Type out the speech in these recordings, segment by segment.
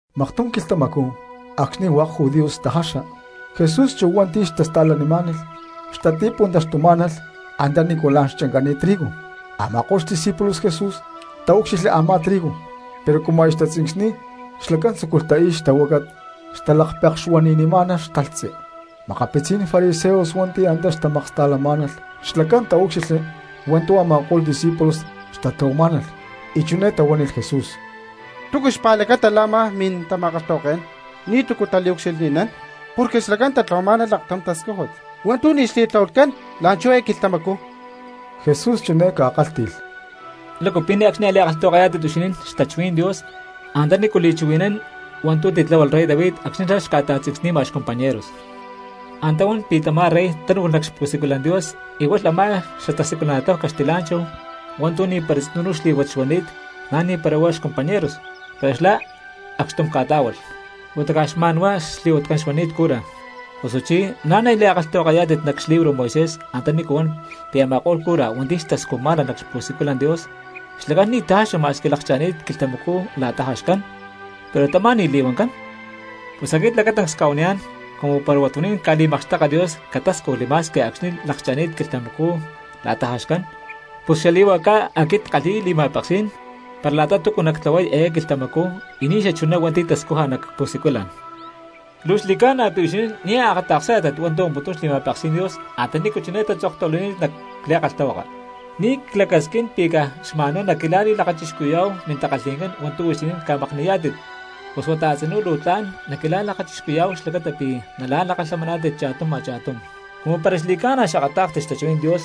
Maktum quilhtamacú acxni̠ hua̠k judíos xtajaxa Jesús chu hua̠nti̠ xtasta̠lanimá̠nalh xtati̠puntaxtumá̠nalh antanícu la̠n xchancani̠t trigo. Ama̠ko̠lh xdiscípulos Jesús taúcxilhli a̠má trigo pero cumu aya xtatzincsni̠y xlacán tzúculh tai̠y xtahuácat, xtalakpekxa y xtahuani̠niy xtalhtzi. Makapitzí̠n fariseos hua̠nti̠ na̠ antá xtamaksta̠lamá̠nalh xlacán taúcxilhli hua̠ntu̠ a̠ma̠ko̠lh discípulos xtatlahuamá̠nalh y chiné tahuánilh Jesús: —¿Túcu xpa̠lacata la̠ a̠má mintama̠kalhtahuaké̠n ni̠tu̠cu taliucxilhni̠nán porque xlacán tatlahuamá̠nalh aktum tascújut hua̠ntu̠ ni̠ xli̠tlahuatcán la̠nchú eé quilhtamacú? Jesús chiné ca̠kálhti̠lh: —¿Lácu pi̠ ne̠cxni a̠li̠kalhtahuakayá̠tit huixinín xtachuhuí̠n Dios antanícu li̠chuhui̠nán hua̠ntu̠ titláhualh rey David acxni̠ xlá xca̠ta̠tzincsni̠ma xcompañeros? Antá huán pi̠ tamá rey tánu̠lh nac xpu̠siculan Dios y hualh a̠má xatasiculana̠tláhu caxtilá̠nchahu hua̠ntu̠ ni̠para tzinú xlí̠huat xuani̠t na̠ ni̠para huá xcompañeros, pero xlá acxtum ca̠tá̠hualh, huata caj xma̠nhuá xli̠huatcán xuani̠t cura. Osuchí, ¿na̠ nia̠ li̠kalhtahuakayá̠tit nac xlibro Moisés antanícu huan pi̠ a̠ma̠ko̠lh cura hua̠nti̠ tascujmá̠nalh nac xpu̠siculan Dios xlacán ni̠ tajaxa ma̠squi lakcha̠ni̠t quilhtamacú la̠ta jaxcán, pero tamá ni̠ li̠huancán? Pus aquit lacatancs cca̠huaniyá̠n cumu para huatuní̠n ca̠li̠makxteka Dios catáscujli ma̠squi acxni̠ lakcha̠ni̠t quilhtamacú la̠ta jaxcán, pus xali̠huacá aquit ckalhi̠y li̠ma̠peksí̠n para la̠ta túcu nactlahuay eé quilhtamacú y ni̠xachuná hua̠nti̠ tascuja nac pu̠siculan. Luu xli̠ca̠na pi̠ huixinín nia̠ akata̠ksá̠tit hua̠ntu̠ huamputún xli̠ma̠peksí̠n Dios antanícu chiné tatzoktahuilani̠t nac li̠kalhtahuaka: “Ni̠ clacasquín pi̠ caj xma̠nhuá naquila̠li̠lakachixcuhui̠yá̠hu mintakalhi̠ncán hua̠ntu̠ huixinín ca̠makni̠yá̠tit, pus huata a̠tzinú luu tla̠n naquila̠li̠lakachixcuhui̠yá̠hu xlacata pi̠ nala̠lakalhamaná̠tit cha̠tum a̠cha̠tum.” Cumu para xli̠ca̠na xakatá̠kstit xtachuhuí̠n Dios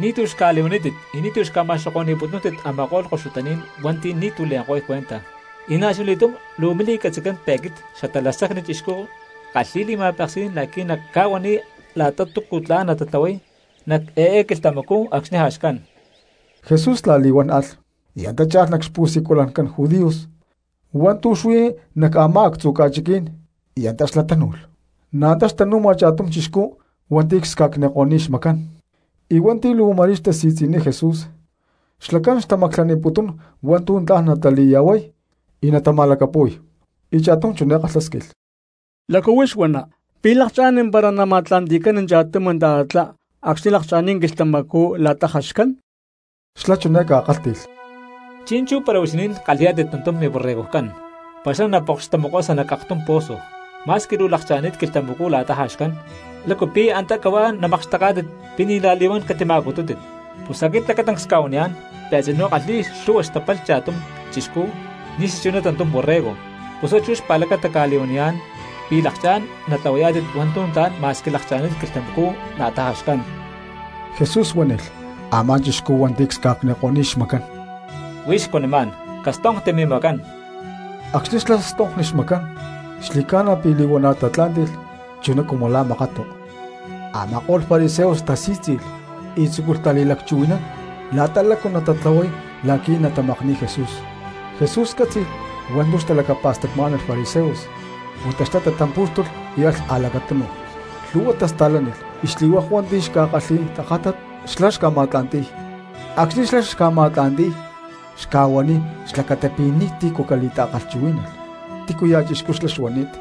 ni̠tu̠ xca̠li̠huanítit y ni̠ xca̠ma̠xoko̠ni̠putúntit a̠ma̠ko̠lh koxutaní̠n cristianos hua̠nti̠ ni̠tu̠ le̠nko̠y cuenta. Y na̠chuna li̠túm luu mili̠catzi̠tcán pi̠ aquit Xatalacsacni Chixcú ckalhi̠y li̠ma̠peksí̠n la̠qui̠ nacca̠huaniy cristianos la̠ta túcu tla̠n natatlahuay nac eé quilhtamacú acxni̠ jaxcán. Jesús la̠li̠huán alh y antá cha̠lh nac xpu̠siculancán judíos hua̠ntu̠ xuí nac a̠má actzu ca̠chiquí̠n y antá xlá tánu̠lh. Na̠ antá xtanu̠ma cha̠tum chixcú hua̠nti̠ csca̠cniko̠ni̠t xmacán. Cumu hua̠nti̠ luu ma̠rí xtasi̠tzi̠niy Jesús xlacán xtamaclaniputún hua̠ntu̠ tla̠n natali̠ya̠huay y natama̠lacapu̠y, y cha̠tum chiné kalhásquilh: —¿Lácu huix huana, pi̠ lakchá̠n para nama̠tla̠nti̠cán cha̠tum ta̠tatlá acxni̠ lakcha̠ni̠t quilhtamacú la̠ta jaxcán? Xlá chiné ca̠kálhti̠lh: —Chi̠nchú para huixinín kalhi̠yá̠tit tantum miborregojcán, para xlá na̠ pokx tamokosa nac aktum pozo, ma̠squi luu lakcha̠ni̠t quilhtamacú la̠ta jaxcán, ¿lácu pi̠ antá cahuá namakxteká̠tit pi̠ ni̠ la̠li̠huán catima̠cutútit? Pus aquit lacatancs cca̠huaniyá̠n pi̠ a̠tzinú kalhi̠y lhu̠hua xtapalh cha̠tum cristiano ni̠xachuná tantum borrego. Pus huá chú xpa̠lacata cca̠li̠huaniyá̠n pi̠ lakchá̠n natlahuayá̠tit hua̠ntu̠ tla̠n ma̠squi lakcha̠ni̠t quilhtamacú la̠ta jaxcán. Jesús huánilh a̠má chixcú hua̠nti̠ csca̠cniko̠ni̠t xmacán: —Huix cuanimá̠n, castonkti mimacán. Acxni̠ xlá stonkli xmacán xli̠ca̠na pi̠ li̠huana̠ tatla̠ntí̠nilh chuná cumu la̠ makatu. Ama̠ko̠lh fariseos tasí̠tzi̠lh y tzúculh tali̠lacchuhui̠nán la̠ta lácu natatlahuay la̠qui̠ natamakni̠y Jesús. Jesús cátzi̠lh hua̠ntu̠ xtalacapa̠stacmá̠nalh fariseos huata xlá tatampú̠xtulh y alh a̠lacatunu. Luu lhu̠hua cristianos tasta̠lánilh y xli̠hua̠k hua̠nti̠ xca̠kalhi̠y tajátat xlá xca̠ma̠tla̠nti̠y. Acxni̠ xlá xca̠ma̠tla̠nti̠y xca̠huaniy xlacata pi̠ ni̠tícu catali̠ta̠chuhuí̠nalh tícuya̠ chixcú xla̠ xuani̠t.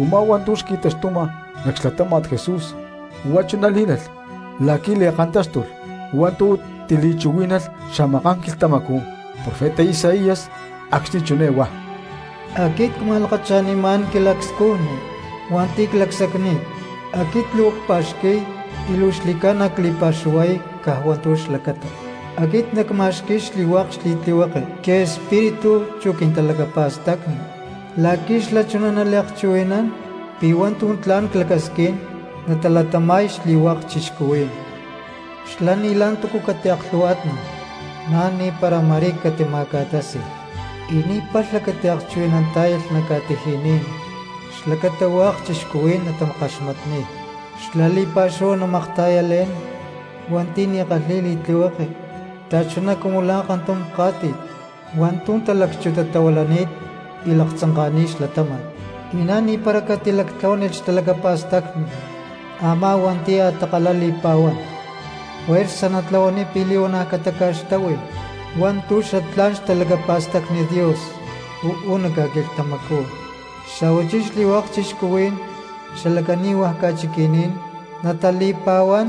Umá hua̠ntu̠ xqui̠taxtuma nac xlatáma̠t Jesús huá chuná lí̠lalh la̠qui̠ li̠kantáxtulh hua̠ntu̠ tili̠chuhuí̠nalh xamaká̠n quilhtamacú profeta Isaías acxni̠ chiné huá: Aquit cca̠ma̠lakacha̠nimá̠n quilacscujni hua̠nti̠ clacsacni̠t. Aquit luu cpa̠xqui̠y y luu xli̠ca̠na cli̠pa̠xuhuay caj hua̠ntu̠ xlacata. Aquit nacma̠xqui̠y xli̠hua̠k xli̠tlihueke quiespíritu chu quintalacapa̠stacni la̠qui̠ xlá chuná naliakchuhui̠nán pi̠ hua̠ntu̠ tla̠n clacasquín natalatama̠y xli̠hua̠k cristianos. Xlá ni̠ la̠ntúcu catiaklhu̠huá̠tnalh, na̠ ni̠para ma̠rí catima̠ca̠tási̠lh, y ni̠ palha catiakchuhui̠nantá̠yalh nac ca̠tiji̠ní̠n xlacata hua̠k cristianos natakaxmatniy. Xlá li̠pa̠xúhu namakta̠yalé̠n hua̠nti̠ ni̠ kalhi̠y li̠tlihueke xta̠chuná cumu la̠ kantum ká̠ti̠t hua̠ntu̠ talacchuntatahuilani̠t y laktzanka̠ni̠t xlatáma̠t, y na̠ ni̠para catilactlahuánilh xtalacapa̠stacni a̠má hua̠nti̠ a̠takalá li̠pa̠huán, juerza natlahuaniy pi̠ li̠huana̠ cataca̠xtáhui hua̠ntu̠ xatlá̠n xtalacapa̠stacni Dios uú nac ca̠quilhtamacú, y xa̠huachí xli̠hua̠k cristianos xala cani̠hua ca̠chiqui̠ní̠n natali̠pa̠huán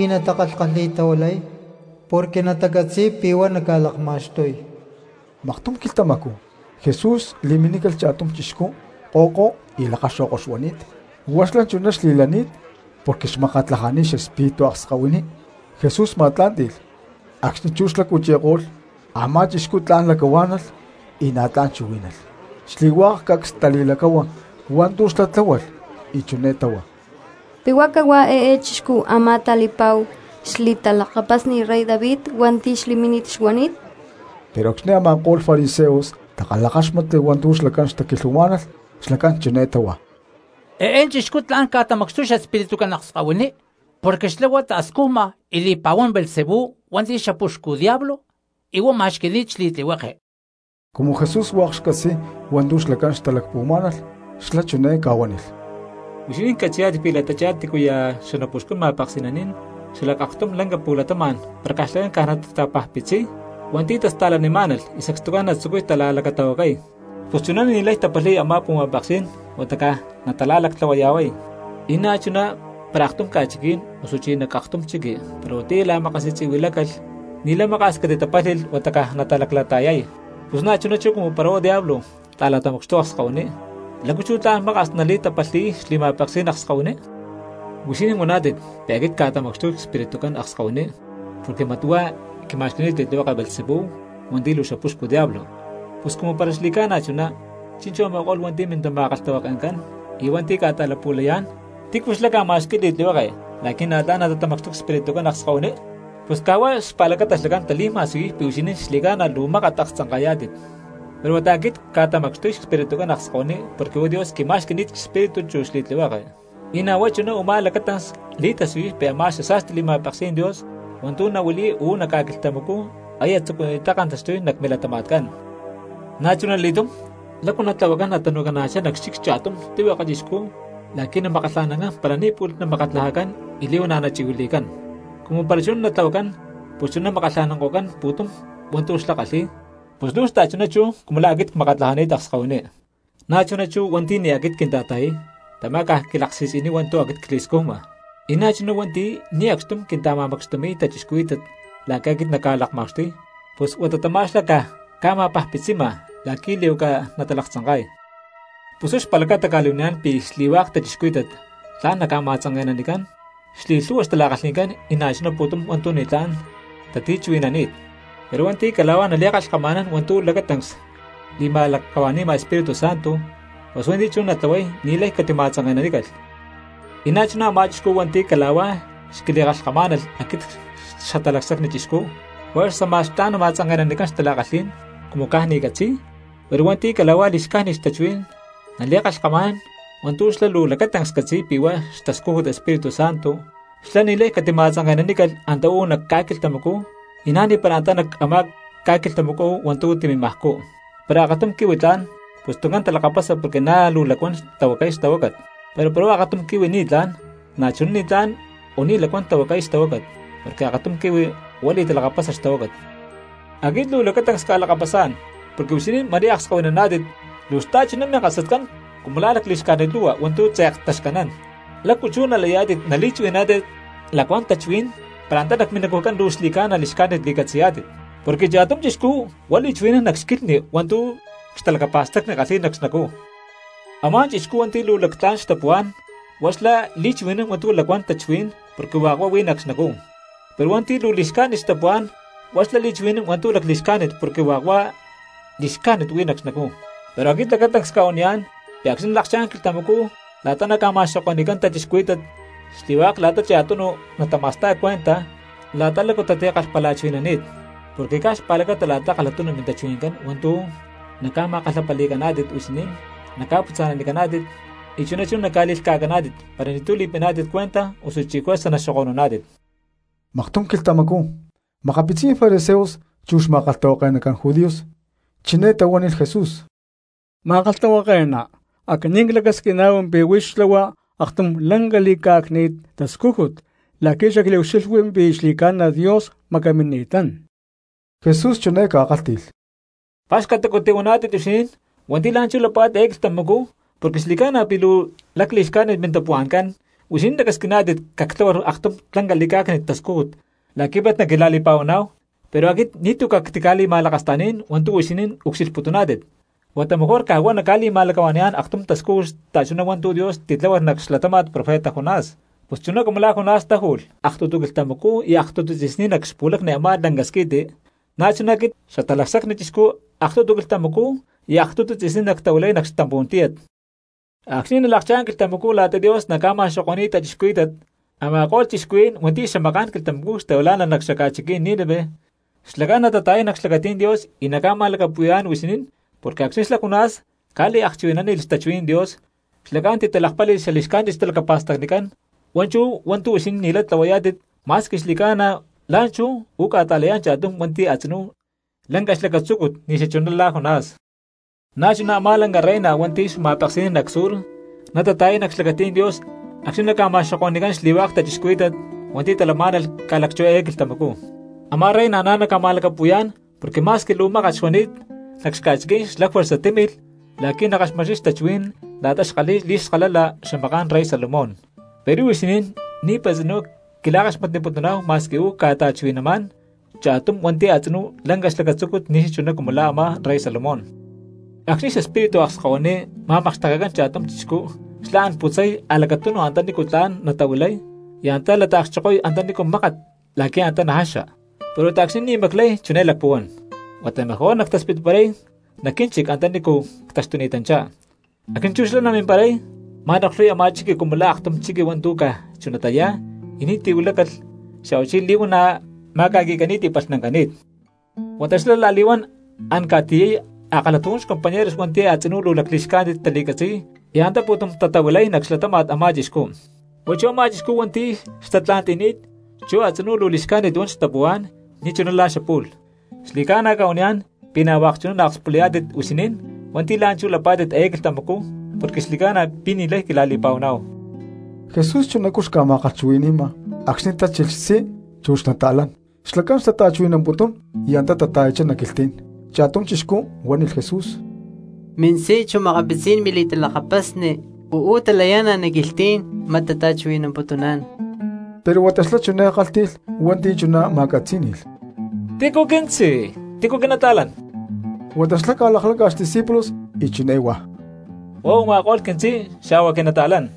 y natakalhkalhi̠tahuilay, porque natacatzi̠y pi̠ huá naca̠lakma̠xtuy. Maktum quilhtamacú Jesús li̠minícalh cha̠tum chixcú ko̠ko y lakaxo̠ko xuani̠t; huá xlá chuná xlani̠t porque xmakatlajani̠t xespíritu akskahuiní. Jesús ma̠tlá̠nti̠lh; acxni̠ chú xlá cuchi̠ko̠lh a̠má chixcú tla̠n lacahuá̠nalh y na̠ tla̠n chuhuí̠nalh. Xli̠hua̠k cristianos cacs tali̠lacáhua hua̠ntu̠ xlá tláhualh y chiné táhua: —¿Pi̠ huá cahuá eé chixcú a̠má tali̠pa̠hu xli̠talakapasni rey David hua̠nti̠ xli̠mínit xuani̠t? Pero acxni̠ a̠ma̠ko̠lh fariseos takalhakáxmatli hua̠ntu̠ xlacán xtaquilhuamá̠nalh xlacán chiné táhua: —Eé chixcú tla̠n ca̠tamacxtuy xespiritucán akskahuiní porque xlá huá ta̠scujma y li̠pa̠huán Beelzebú hua̠nti̠ xapuxcu diablo, y huá ma̠xqui̠ni̠t xli̠tlihueke. Cumu Jesús hua̠k xcatzi̠y hua̠ntu̠ xlacán xtalacpuhuamá̠nalh xlá chiné ca̠huánilh: —Huixinín catzi̠yá̠tit pi̠ la̠tachá tícuya̠ xanapuxcún ma̠peksi̠naní̠n xalac aktum lanca pu̠latama̠n para xlacán caj natatapajpitziy hua̠nti̠ tasta̠lanimá̠nalh y sacstucán natzucuy tala̠lacatahuacay, pus chuná ni̠lay tapalhi̠y a̠má pu̠ma̠peksí̠n huata caj natala̠lactlahuaya̠huáy. Y na̠chuná para aktum ca̠chiquí̠n osuchí nac aktum chiqui para huatiyá la̠makasi̠tzi̠huilácalh, ni̠lay maka̠s catitatapálhi̠lh huata caj natalaclata̠yay. Pus na̠chuná chú cumu para huá diablo ta̠la̠tamacxtuy akskahuiní, ¿lácu chú tla̠n maka̠s nali̠tapalhi̠y xli̠ma̠peksí̠n akskahuiní? Huixinín huántit pi̠ aquit cca̠tamacxtuy xespiritucán akskahuiní porque mat huá quima̠xqui̠ni̠t xli̠tlihueke Beelzebú hua̠nti̠ luu xapuxcu diablo. Pus cumu para xli̠ca̠na chuná, chi̠nchú a̠ma̠ko̠lh hua̠nti̠ mintama̠kalhtahuake̠ncán y hua̠nti̠ ca̠ta̠lapu̠layá̠n, ¿tícu xlá ca̠ma̠xqui̠y li̠tlihueke la̠qui̠ na̠ tla̠n natatamacxtuy xespiritucán akskahuiní? Pus caj huá xpa̠lacata xlacán tali̠ma̠siyuy pi̠ huixinín xli̠ca̠na luu mákat aktzanka̠yá̠tit. Pero huata aquit cca̠tamacxtuy xespiritucán akskahuiní porque huá Dios quima̠xqui̠ni̠t xespíritu chu xli̠tlihueke, y na̠ huá chú u̠má lacatancs li̠tasiyuy pi̠ a̠má xasa̠sti xli̠ma̠peksí̠n Dios hua̠ntu̠ nahuili̠y uú nac ca̠quilhtamacú aya tzucuni̠ttá kantaxtuy nac milatama̠tcán. ’Na̠chunali̠túm, ¿lácu natlahuacán natanu̠cana̠chá nac xchic cha̠tum tlihueke chixcú la̠qui̠ namakkalha̠nán para ni̠ pu̠lh namakatlajacán y li̠huana̠ nachi̠huili̠cán? Cumu para chuná natlahuacán pus chuná namakkalhanko̠cán pu̠tum hua̠ntu̠ xlá kalhi̠y. Pus luu xta̠chuná chú cumu la̠ aquit cmakatlajani̠t akskahuiní. ’Na̠ chuná chú hua̠nti̠ ni̠ aquit quinta̠ta̠yay tamá caj quilaksi̠tzi̠niy hua̠ntu̠ aquit cli̠scujma, y na̠chuná hua̠nti̠ ni̠ acxtum quinta̠ma̠macxtumi̠y cristianos la̠qui̠ aquit nacca̠lakma̠xtuy pus huata tamá xlá caj ca̠ma̠pajpitzima la̠qui̠ li̠huaca natalaktzanka̠y. ’Pus huá xpa̠lacata cca̠li̠huaniyá̠n pi̠ xli̠hua̠k cristianos tla̠n naca̠ma̠tzanke̠nanicán xli̠lhu̠hua xtala̠kalhi̠ncán y na̠chuná pu̠tum hua̠ntu̠ ni̠tlá̠n tatichuhui̠nani̠t, pero hua̠nti̠ cala̠huá nali̠kalhkama̠nán hua̠ntu̠ lacatancs li̠ma̠lacahua̠ni̠ma Espíritu Santo pus hua̠nti̠ chuná natlahuay ni̠lay catima̠tzanke̠nanícalh. Y na̠chuná a̠má chixcú hua̠nti̠ cala̠huá xquili̠kalhkamá̠nalh aquit Xatalacsacni Chixcú, juerza ma̠x tla̠n nama̠tzanke̠nanicán xtala̠kalhí̠n cumu caj ni̠ catzi̠y, pero hua̠nti̠ cala̠huá li̠xcájnit tachuhuí̠n nali̠kalhkama̠nán hua̠ntu̠ xlá luu lacatancs catzi̠y pi̠ huá xtascújut Espíritu Santo, xlá ni̠lay catima̠tzanke̠nanícalh antá uú nac ca̠quilhtamacú y na̠ ni̠para antá nac a̠má ca̠quilhtamacú hua̠ntu̠ timimajcú. ’Para akatum quihui tla̠n, pus tuncán talakapasa porque na̠ luu lacuán tahuacay xtahuácat; pero para akatum quihui ni̠tlá̠n, na̠chuná ni̠tlán o ni̠ lacuán tahuacay xtahuácat; porque akatum quihui huá li̠talakapasa xtahuácat. Aquit luu lacatancs cca̠lakapasá̠n porque huixinín ma̠ri akskahuinaná̠tit, ¡luu xta̠chuná minkasatcán cumu lá lacli̠xcájnit lu̠hua hua̠ntu̠ tze̠k taxcanán! ¿Lácu chú nalayá̠tit nali̠chuhui̠naná̠tit lacuán tachuhuí̠n para antá nac minacujcán luu xli̠ca̠na li̠xcájnit li̠catzi̠yá̠tit? Porque cha̠tum chixcú huá li̠chuhui̠nán nac xquilhni hua̠ntu̠ xtalacapa̠stacni kalhi̠y nac xnacú. Amá chixcú hua̠nti̠ luu tla̠n xtapuhuá̠n huá xlá li̠chuhui̠nán hua̠ntu̠ lacuán tachuhuí̠n porque hua̠k huá huí nac xnacú; pero hua̠nti̠ luu li̠xcájnit xtapuhuá̠n huá xlá li̠chuhui̠nán hua̠ntu̠ lacli̠xcájnit porque hua̠k huá tu̠ li̠xcájnit huí nac xnacú. Pero aquit lacatancs cca̠huaniyá̠n pi̠ acxni̠ nalakchá̠n quilhtamacú la̠ta naca̠ma̠xoko̠ni̠cán cristianos, xli̠hua̠k la̠ta cha̠tunu cristianos natama̠sta̠y cuenta la̠ta lácu tatikalhpalachuhui̠nani̠t. Porque caj xpa̠lacata la̠ta kalhatunu mintachuhui̠ncán hua̠ntu̠ naca̠ma̠kalhapali̠caná̠tit huixinín naca̠putza̠nanicaná̠tit, y chuná chú naca̠li̠lhca̠caná̠tit para ni̠tu̠ li̠piná̠tit cuenta osuchí juerza naxoko̠nuná̠tit. Maktum quilhtamacú makapitzí̠n fariseos chu xma̠kalhtahuake̠nacán judíos chiné tahuánilh Jesús: —Ma̠kalhtahuake̠ná, aquinín clacasquiná̠hu pi̠ huix xtlahua aktum lanca li̠cá̠cni̠t tascújut la̠qui̠ xacliucxilhwi pi̠ xli̠ca̠na Dios macamini̠tán. Jesús chiné ca̠kálhti̠lh: —Pa̠xcatacu tihuaná̠tit huixinín cristianos hua̠nti̠ la̠nchú lapá̠tit eé quilhtamacú porque xli̠ca̠na pi̠ luu lacli̠xcájnit mintapuhua̠ncán, huixinín lacasquiná̠tit cactláhualh aktum lanca li̠cá̠cni̠t tascújut la̠qui̠ mat naquila̠li̠pa̠huaná̠hu. Pero aquit ni̠tu̠ cactica̠li̠ma̠lakasta̠ní̠n hua̠ntu̠ huixinín ucxilhputuná̠tit, huata mejor caj huá nacca̠li̠ma̠lacahua̠ni̠yá̠n aktum tascújut xta̠chuná hua̠ntu̠ Dios titláhualh nac xlatáma̠t profeta Jonás. Pus chuná cumu la̠ Jonás táju̠lh aktutu quilhtamacú y aktutu tzi̠sní nac xpu̠lacni a̠má lanca squi̠ti, na̠chuná chú aquit Xatalacsacni Chixcú aktutu quilhtamacú y aktutu tzi̠sní nactaju̠y nac xtampú̠n tíyat. Acxni̠ nalakchá̠n quilhtamacú la̠ta Dios naca̠ma̠xoko̠ni̠y cristianos, a̠ma̠ko̠lh cristianos hua̠nti̠ xamaká̠n quilhtamacú xtahuilá̠nalh nac xaca̠chiquí̠n Nínive xlacán natata̠yay nac xlacatí̠n Dios y naca̠ma̠lacapu̠yá̠n huixinín, porque acxni̠ xlá Jonás ca̠liakchuhui̠nánilh xtachuhuí̠n Dios xlacán titalakpáli̠lh xali̠xcájnit xtalacapa̠stacnicán; huá chú hua̠ntu̠ huixinín ni̠lay tlahuayá̠tit ma̠squi xli̠ca̠na la̠nchú uú ca̠ta̠layá̠n cha̠tum hua̠nti̠ a̠tzinú lanca xlacatzúcut ni̠xachuná la̠ Jonás. Na̠ chuná a̠má lanca reina hua̠nti̠ xma̠peksi̠nán nac Sur na̠ nata̠yay nac xlacatí̠n Dios acxni̠ naca̠ma̠xoko̠ni̠cán xli̠hua̠k cristianos hua̠nti̠ talamá̠nalh ca̠lacchú eé quilhtamacú, a̠má reina na̠ naca̠ma̠lacapu̠yá̠n porque ma̠squi luu mákat xuani̠t nac xca̠chiquí̠n xlá juerza tímilh la̠qui̠ nakaxmatniy xtachuhuí̠n la̠ta xkalhi̠y xli̠skalala xamaká̠n rey Salomón, pero huixinín ni̠para tzinú quila̠kaxmatniputuná̠hu ma̠squi uú ca̠ta̠chuhui̠namá̠n cha̠tum hua̠nti̠ a̠tzinú lanca xlacatzúcut ni̠xachuná cumu la̠ a̠má rey Salomón. ’Acxni̠ xespíritu akskahuiní ma̠makxtekecán cha̠tum chixcú xlá an putzay a̠lacatunu antanícu tla̠n natahuilay y an lata̠kchokoy antanícu mákat la̠qui̠ antá najaxa. Pero huata acxni̠ ni̠ maclay chiné lacpuhuán: “Huata mejor nactaspitparay nac quínchic anta nícu ctaxtuni̠tanchá.” Acxni̠ chú xlá chimparay, ma̠noklhuy a̠má chixcú cumu la̠ aktum chiqui hua̠ntu̠ caj chunatá yá y ni̠tu̠ huilácalh xa̠huachí li̠huana̠ ma̠ca̠qui̠cani̠t y palhnancani̠t. Huata xlá la̠li̠huán an ca̠tiyay a̠kalhatujún xcompañeros hua̠nti̠ a̠tzinú luu lacli̠xcájnit tali̠catzi̠y y antá pu̠tum tatahuilay nac xlatáma̠t a̠má chixcú. Huá chú a̠má chixcú hua̠nti̠ xtatla̠nti̠ni̠t, chú a̠tzinú luu li̠xcájnit huan xtapuhuá̠n ni̠chuná la̠ xapu̠lh. Xli̠ca̠na cca̠huaniyá̠n pi̠ na̠ hua̠k chuná naakspulayá̠tit huixinín hua̠nti̠ la̠nchú lapá̠tit eé quilhtamacú porque xli̠ca̠na pi̠ ni̠lay quila̠li̠pa̠huaná̠hu. Jesús chunacú xca̠ma̠kalhchuhui̠ni̠ma cristianos acxni̠ tachilh xtzí chu makapitzí̠n xli̠talakapasni xlacán xtata̠chuhui̠namputún y antá tata̠yachá nac quilhtí̠n. Cha̠tum chixcú huánilh Jesús: —Mintzí chu makapitzí̠n mili̠talakapasni uú talayá̠nalh nac quilhtí̠n, mat tata̠chuhui̠namputuná̠n. Pero huata xlá chiné kálhti̠lh hua̠nti̠ chuná ma̠catzí̠ni̠lh: —¿Tícu quintzí, y tícu quili̠talakapasni? Huata xlá huá ca̠lakláca̠lh xdiscípulos y chiné huá: —Huá u̠ma̠ko̠lh quintzí xa̠huá quili̠talakapasni.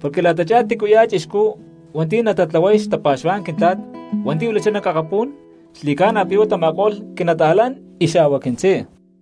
Porque la̠tachá tícuya̠ cristiano hua̠nti̠ natatlahuay xtapa̠xuhuá̠n Quintla̠t hua̠nti̠ huilachá nac akapú̠n xli̠ca̠na pi̠ huá tama̠ko̠lh quili̠talakapasni xa̠huá quintzí.